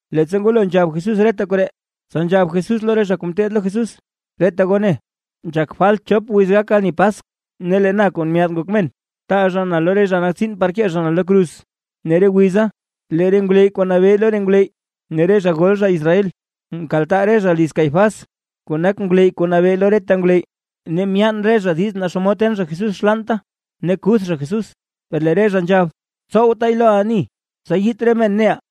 Leettsa ngwalo nzhab Jesús reta koree, tsa nzhab Jesús lo re zha kuu ngeteed lo Jesús: ―Reta goo ne, nzhak falt chop wiz gak ani Paskw, lee na Kuu Myaad Ngok Men, taa zha na lo re zha nak tsiin par kee zha na lo kruz. Ne re wiza lee re ngwleyy kuu nabee lo re ngwleyy, ne re zha gol zha Israel, mkaltaa re zha liz Caifás kuu nak ngwleyy kuu nabee lo reta ngwleyy. Ne myaan re zha diiz naa xomod ten zha Jesús xlaanta, ne kuth zha Jesús. Per lee re zha nzhab: ―Tsowtaay lo ani, tsa yiit re men neʼaa.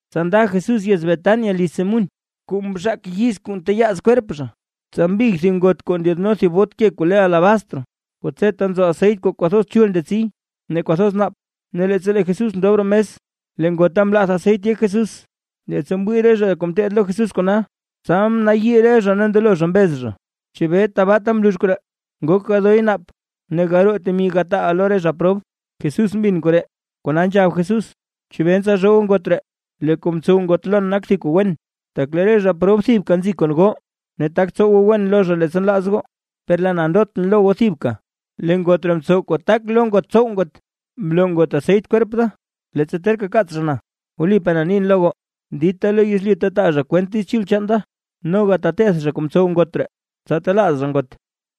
Tsa nda Jesús yez Betania liz Simún kuu mzhaak yiz kuu nteyaaz kwerp zha. Tsa mbig thib ngot kuu ndyaadno thib bot ke kuu le alabastr, kuu tseta nzo aseyt kuu kwathoz chul ndetsi ne kwathoz naap. Ne leettsa lee Jesús ndob roo mes, lee ngota mlath aseyt yek Jesús. Leettsa mwii re zha kuu ngeteed lo Jesús kona, tsa mnayii re zha ne mndelo zha mbez zha: ―¿Chebee tbaata mlux koree? Ngok gadoy naap, ne garoo temi gataa lo re zha prob. Jesús mbin koree, kona nzhab Jesús: ―¿Chebee ntsalzhoo goo ngot ree? Lee kuu mtsow ngot lon nak thib kuu wen. Tak lee re zha prob thibka nzi kon goo, ne tak tsow goo wen lo zha leettsa nlaaz goo, per lee na ndotʼn lo goo thibka. Lee ngot ree mtsow kuu tak lo ngot tsow ngot, mloo ngot aseyt kwerp da leettsa terka kaats zha na. Wlipaa na nin lo goo, dita lo yezlyu ta taa zha kwent Diiz Chul chaan da, noga teteth zha kuu mtsow ngot ree, tsa telaaz zha ngot.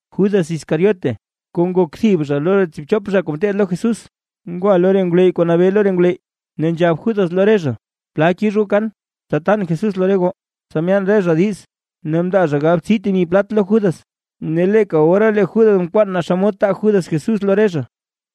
Judas Iscariote, kuu nak thib zha lo re tsiibchop zha kuu ngeteed lo Jesús, ngwa lo re ngwleyy kuu nabee lo re ngwleyy. Ne nzhab Judas lo re zha: ―¿Plal kix goo kan, tsa tan Jesús lo re goo? Tsa myaan re zha diiz, ne mndaa zha galbtsii temi plat lo Judas. Ne leeka ora lee Judas mkwaan naa xomod taa Judas Jesús lo re zhaʼa.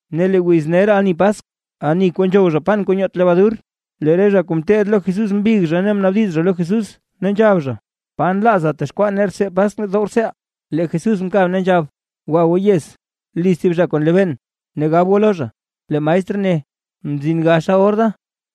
Ne lee wiz ner ani Paskw, ani kuu nzhow zha pan kuu nyoot lebadur, lee re zha kuu ngeteed lo Jesús mbig ne mnaabdiz lo Jesús ne nzhab: ―¿Pa nlaaza texkwaa nee rtsee Paskw dow rtseeʼaa? Lee Jesús mkab ne nzhab: ―Gwa goo yez, liz thib zha kuu nlebeen, ne gab goo lo zha: “Lee maestr ne: Mzin gaxa or da.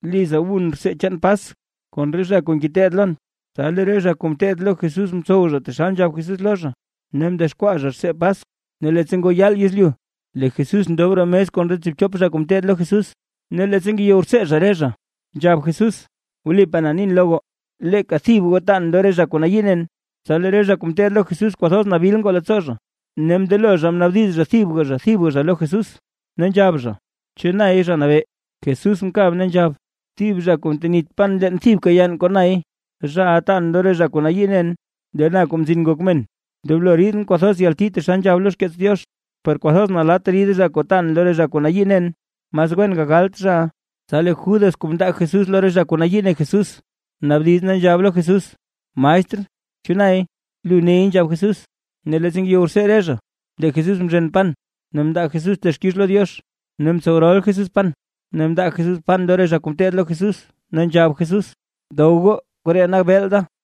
Liza wun rtsee chaan Paskw kon re zha kuu ngeteed lon.” Tsa lee re zha kuu ngeteed lo Jesús mtsow zha taxal nzhab Jesús lo zha. Ne mdexkwaa zha rtsee Paskw. Ne leettsa ngoo yaal yezlyu, lee Jesús ndob roo mes kon re tsiibchop zha kuu ngeteed lo Jesús. Ne leettsa ngeyow rtsee re zha, nzhab Jesús: ―Wlipaa na nin lo goo, leeka thib goo tan lo re kuu nayii nen. Tsa lee re zha kuu ngeteed lo Jesús kwathoz nabil ngoo leettsoo zha, ne mndelo zha mnaabdiz zha thibga thibga zha lo Jesús, ne nzhab zha: ―¿Chu nay? Zha Nabee. Jesús mkab ne nzhab: ―Thib zha kuu ntenit pan leen thibka yann kon nay, zhaʼa taan lo re zha kuu nayii nen. Lee na Kuu Mzin Ngok Men, ndoblo ridʼn kwathoz yalti taxal nzhab lo xkeets Diox, per kwathoz nalatt rid zha kuu taan lo re zha kuu nayii nen. Mas wen gagalt zhaʼa. Tsa lee Judas kuu mndaa Jesús lo re zha kuu nayii ne Jesús, mnaabdiz ne nzhab lo Jesús: ―Maestr, ¿chu nay? ―Lu ney ―nzhab Jesús. Ne leettsa ngeyow rtsee re zha, lee Jesús mzhen pan, ne mndaa Jesús texkix lo Diox, ne mtsow rol Jesús pan, ne mndaa Jesús pan lo re zha kuu ngeteed lo Jesús, ne nzhab Jesús: ―Dow goo, koree nak beel da.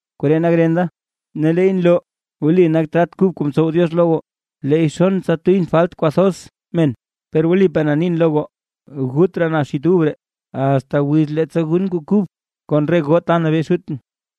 Koree nak ren da, ne leey nloo wli nak trat kub kuu mtsow Diox lo goo. Leey xon tsa tuyʼn falt kwathoz men. Per wlipaa na nin lo goo, gut raa na xit ub ree, asta wiz kuu leettsa gun kuu kub kon re goo ta nabee Xutʼn.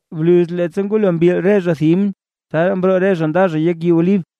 Bluz leettsa ngwalo mbil re zha thib himn, tsa mroo re zha nda zha yek yii Olib.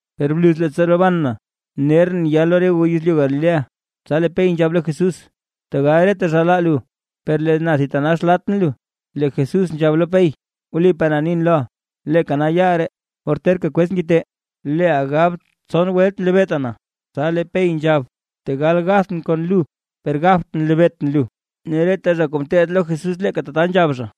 Per bluz leettsa roban na, nerʼn ya lo re goo yezlyu Galilea. Tsa lee Pey nzhab lo Jesús: ―¡Tegal reta zha laa lu, per lee na thitanax latʼn lu! Lee Jesús nzhab lo Pey: ―Wlipaa na nin loʼa, leeka nal yaal ree, or terka kwez ngite, leeʼa gab tson welt nlebeeta na. Tsa lee Pey nzhab: ―Tegal gathʼn kon lu, per gabtʼn nlebeetʼn lu. Ne reta re zha kuu ngeteed lo Jesús leeka tata nzhab zha.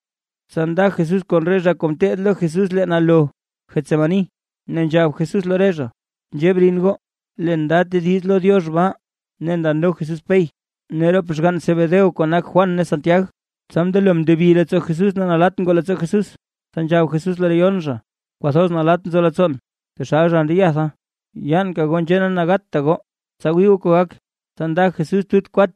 Tsa nda Jesús kon re zha kuu ngeteed lo Jesús leen alo Getsemaní, ne nzhab Jesús lo re zha: ―Nzhee brin goo, leen nda tediz lo Diox baa. Ne ndano Jesús Pey, ne rop xgann Zebedeo kuu nak Juan ne Santiag, tsa mndelo mndebi leettsoo Jesús ne nalatt ngoo leettsoo Jesús. Tsa nzhab Jesús lo re yon zha: ―Kwathoz nalatt nzo leettsoon, taxal zha ndeyatha. Yaanka goo nzhee ne gatta goo tsa wii goo kuu gak. Tsa lee Jesús nda tut kwat,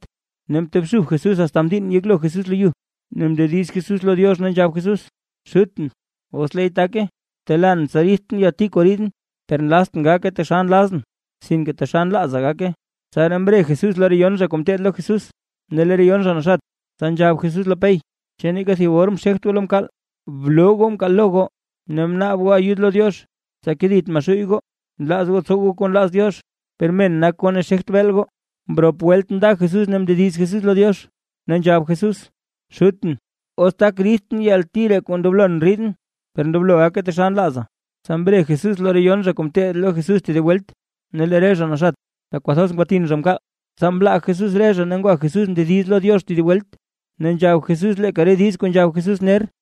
ne mtobxub Jesús asta mdiinn yeklo Jesús lo yu, ne mndediz Jesús lo Diox, ne nzhab Jesús: ―Xutʼn, os leey take, btelaan tsa riidtʼn yalti kuu riidʼn, per nlaztʼn gake taxal nlazʼn, sinke taxal nlaaza gake. Tsaraa mre Jesús lo re yon zha kuu ngeteed lo Jesús, ne lee re yon zha naxat; tsa nzhab Jesús lo Pey: ―¿Chu neeka thib or mxegt goo lo mkaal? Bloo goo mkaal lo goo ne bnaab goo ayud lo Diox, tsa kedit Maxuuy goo. Nlaaz goo tsow goo kuu nlaaz Diox, per men nak goo ne xegt beel goo. Mrop welt nda Jesús ne mndediz Jesús lo Diox, ne nzhab Jesús: ―Xutʼn, os tak riidtʼn yalti ree kuu ndoblon riidʼn; per ndoblo gake taxal nlaaza. Tsa mre Jesús lo re yon zha kuu ngeteed lo Jesús tedib welt, ne lee re zha naxat, tak kwathoz ngwatin zha mkaal. Tsa mlaa Jesús re zha ne ngwa Jesús mndediz lo Diox tedib welt, ne nzhab Jesús leeka re diiz kuu nzhab Jesús ner.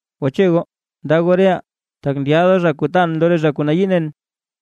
Gwache goo, ndaa goo reʼaa, tak ndyaada zha kuu taan lo re zha kuu nayii nen.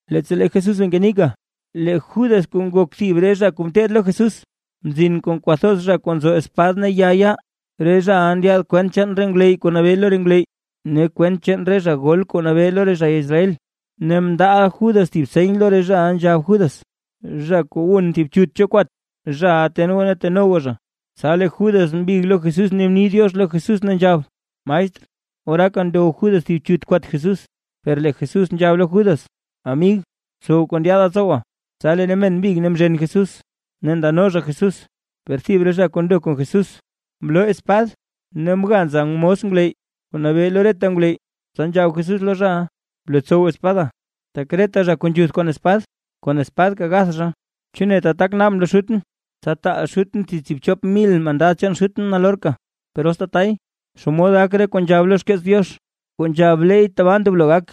Leettsa lee Jesús bee ngenika, lee Judas kuu nak thib re zha kuu mteed lo Jesús, mzin kon kwathoz zha kuu nzo espad ne ya yaa. Re zhaʼa ndyaad kwent chaan re ngwleyy kuu nabee lo re ngwleyy, ne kwent chaan re zha gol kuu nabee lo re zha Israel. Ne mndaaʼa Judas thib seny lo re zhaʼa nzhab Judas: ―Zha kuu wun thib chut cho kwat, zhaʼa ten goo ne teno goo zha. Tsa lee Judas mbig lo Jesús ne mni “diox” lo Jesús ne nzhab: ―¡Maestr! Oraaka ndow Judas thib chut kwat Jesús. Per lee Jesús nzhab lo Judas: ―Amig, btsow kuu ndyaada tsowa. Tsa lee re men mbig ne mzhen Jesús, ne ndano zha Jesús. Per thib re zha kuu ndo kon Jesús, mloo spad ne mga nza mos ngwleyy kuu nabee lo reta ngwleyy. Tsa nzhab Jesús lo zhaʼa: ―Blotsow espada, tak reta zha kuu nzhuth kon spad kon spadka gath zha. ¿Chu neta tak naabʼn lo Xutʼn, tsa taal Xutʼn thib tsiibchop mil mandad chaan Xutʼn nalorka? Per os tatay, ¿xomod gak re kuu nzhab lo xkeets Diox, kuu nzhab leey tabaa ndoblo gak?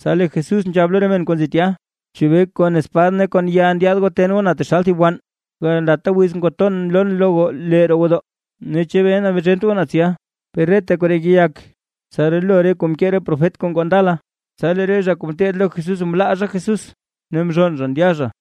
Tsa lee Jesús nzhab lo re men kuu nzi tya: ―¿Chebee kon spad ne kon ya ndyaad goo ten goo na taxal thib wann? Gandata wiz ngwaton mloon lo goo lee roo gwodoo. Ne, ¿chebee mzhent goo na tsya? Per reta koree ngeyak, tsa rolo re kuu mkee re profet kuu ngoo ndala. Tsa lee re zha kuu ngeteed lo Jesús mlaa zha Jesús, ne mzhonn zha ndya zha.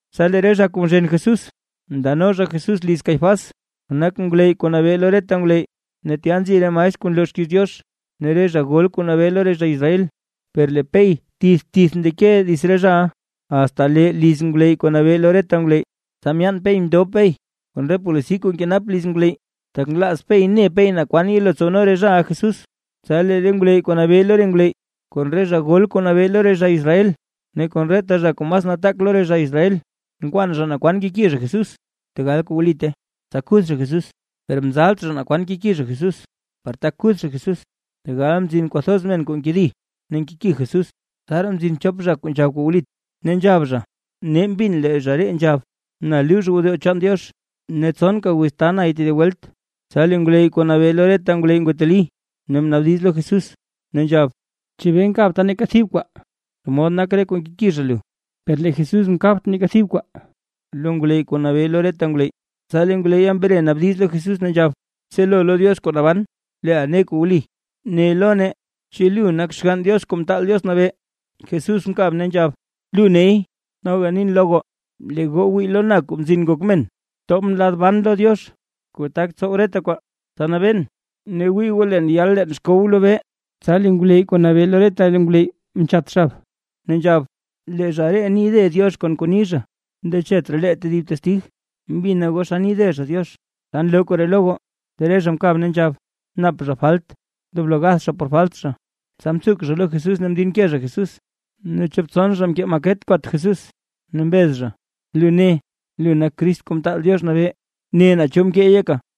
Tsa lee re zha kuu mzhen Jesús ndano zha Jesús liz Caifás, kuu nak ngwleyy kuu nabee lo reta ngwleyy, ne tya nzi re maestr kuu nloo xkiiz Diox ne re zha gol kuu nabee lo re zha Israel. Per lee Pey tith tith ndeke dits re zhaʼa, asta lee liz ngwleyy kuu nabee lo reta ngwleyy, tsa myaan Pey mndob Pey kon re polisi kuu nkenap liz ngwleyy, tak nlaaz Pey ne Pey naa kwan yelo tsowno re zhaʼa Jesús. Tsa lee re ngwleyy kuu nabee lo re ngwleyy, kon re zha gol kuu nabee lo re zha Israel, ne kon reta zha kuu mas nataak lo re zha Israel, nkwaan zha naa kwan keki zha Jesús, tegal kuu wlite, tsa kuth zha Jesús. Per mzalt zha naa kwan keki zha Jesús, par tak kuth zha Jesús, tegal nzin kwathoz men kuu nkedi ne nkeki Jesús. Tsaraa mzin chop zha kuu nzhab kuu wlit, ne nzhab zha: ―Nee mbin lee zha ree nzhab: “Na luux gwodoo chaan Diox, ne tsonka wiz taa nay tedib welt”. Tsa lee ngwleyy kuu nabee lo reta ngwleyy ngwateli, ne mnaabdiz lo Jesús, ne nzhab: ―¿Chebee nkabta neeka thib kwaa? ¿Xomod nak re kuu nkeki zha lu? Per lee Jesús mkabt neeka thib kwaa lo ngwleyy kuu nabee lo reta ngwleyy. Tsa lee ngwleyya mre mnaabdiz lo Jesús ne nzhab: ―Btselo lo Diox kuu naban leeʼa ne kuu wli. Ne lo nee: ¿Chu lu nak Xgann Diox Kuu Mtaal Diox Nabee? Jesús mkab ne nzhab: ―Lu ney. Noga nin lo goo, lee goo wii goo lo na, Kuu Mzin Ngok Men, tobʼn lad ban lo Diox kuu tak tsow reta kwaa, tsa nabeen. Ne wii goo leen yal leen xkow lobee. Tsa lee ngwleyy kuu nabee lo reta ngwleyy mchat xab, ne nzhab: ―¡Lee zha ree ni de Diox! Kon kuu ni zha. Ndechet raa lee tedib testig, mbina goo xa ni de zha Diox. ¿Xa nloo koree lo goo? Lee re zha mkab ne nzhab: ―Nap zha falt, ndoblo gath zha por falt zha. Tsa mtsuk zha lo Jesús ne mdinke zha Jesús. Ne chop tson zha mkee maket kwat Jesús. Ne mbez zha: ―Lu ne, lu nak Crist Kuu Mtaal Diox Nabee, ne naa cho mkeey yeka.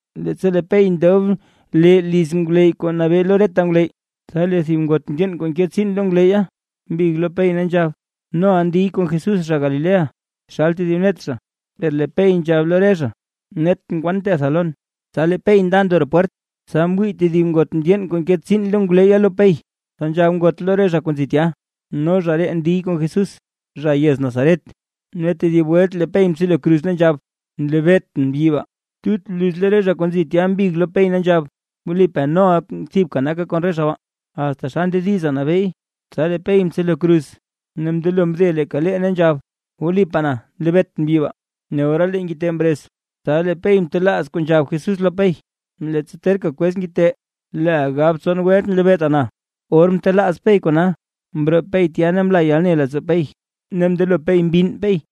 Leettsa lee Pey ndob lee liz ngwleyy kuu nabee lo reta ngwleyy, tsa lee thib ngot mndyeen kuu nke tsiin lo ngwleyya, mbig lo Pey ne nzhab: ―Noʼa ndiy kon Jesús zha Galilea, taxal tedib net zha. Per lee Pey nzhab lo re zha: ―Netʼn kwan ntetha lon. Tsa lee Pey nda ndo roo pwert, tsa mwii tedib ngot mndyeen kuu nke tsiin lo ngwleyya lo Pey, tsa nzhab ngot lo re zha kuu nzi tya: ―No zha ree ndiy kon Jesús, zha yez Nazaret. Ne tedib welt lee Pey mtselo kruz, ne nzhab: ―¡Nlebeetʼn mbyi baa! Tut bluz lee re zha kuu nzi tya, mbig lo Pey ne nzhab: ―Wlipaa noʼa thibka naka kon re zha baa, asta xa ndediza nabeey. Tsa lee Pey mtselo kruz, ne mndelo mde leeka lee, ne nzhab: ―¡Wlipaa na, nlebeetʼn mbyi baa! Ne ora lee ngite mrez. Tsa lee Pey mtelaaz kuu nzhab Jesús lo Pey: “Leettsa terka kwez ngite, leeʼa gab tson welt nlebeeta na”. Or mtelaaz Pey kona, mroo pey tya ne mla yalne leettsoo Pey ne mndelo Pey mbinn Pey.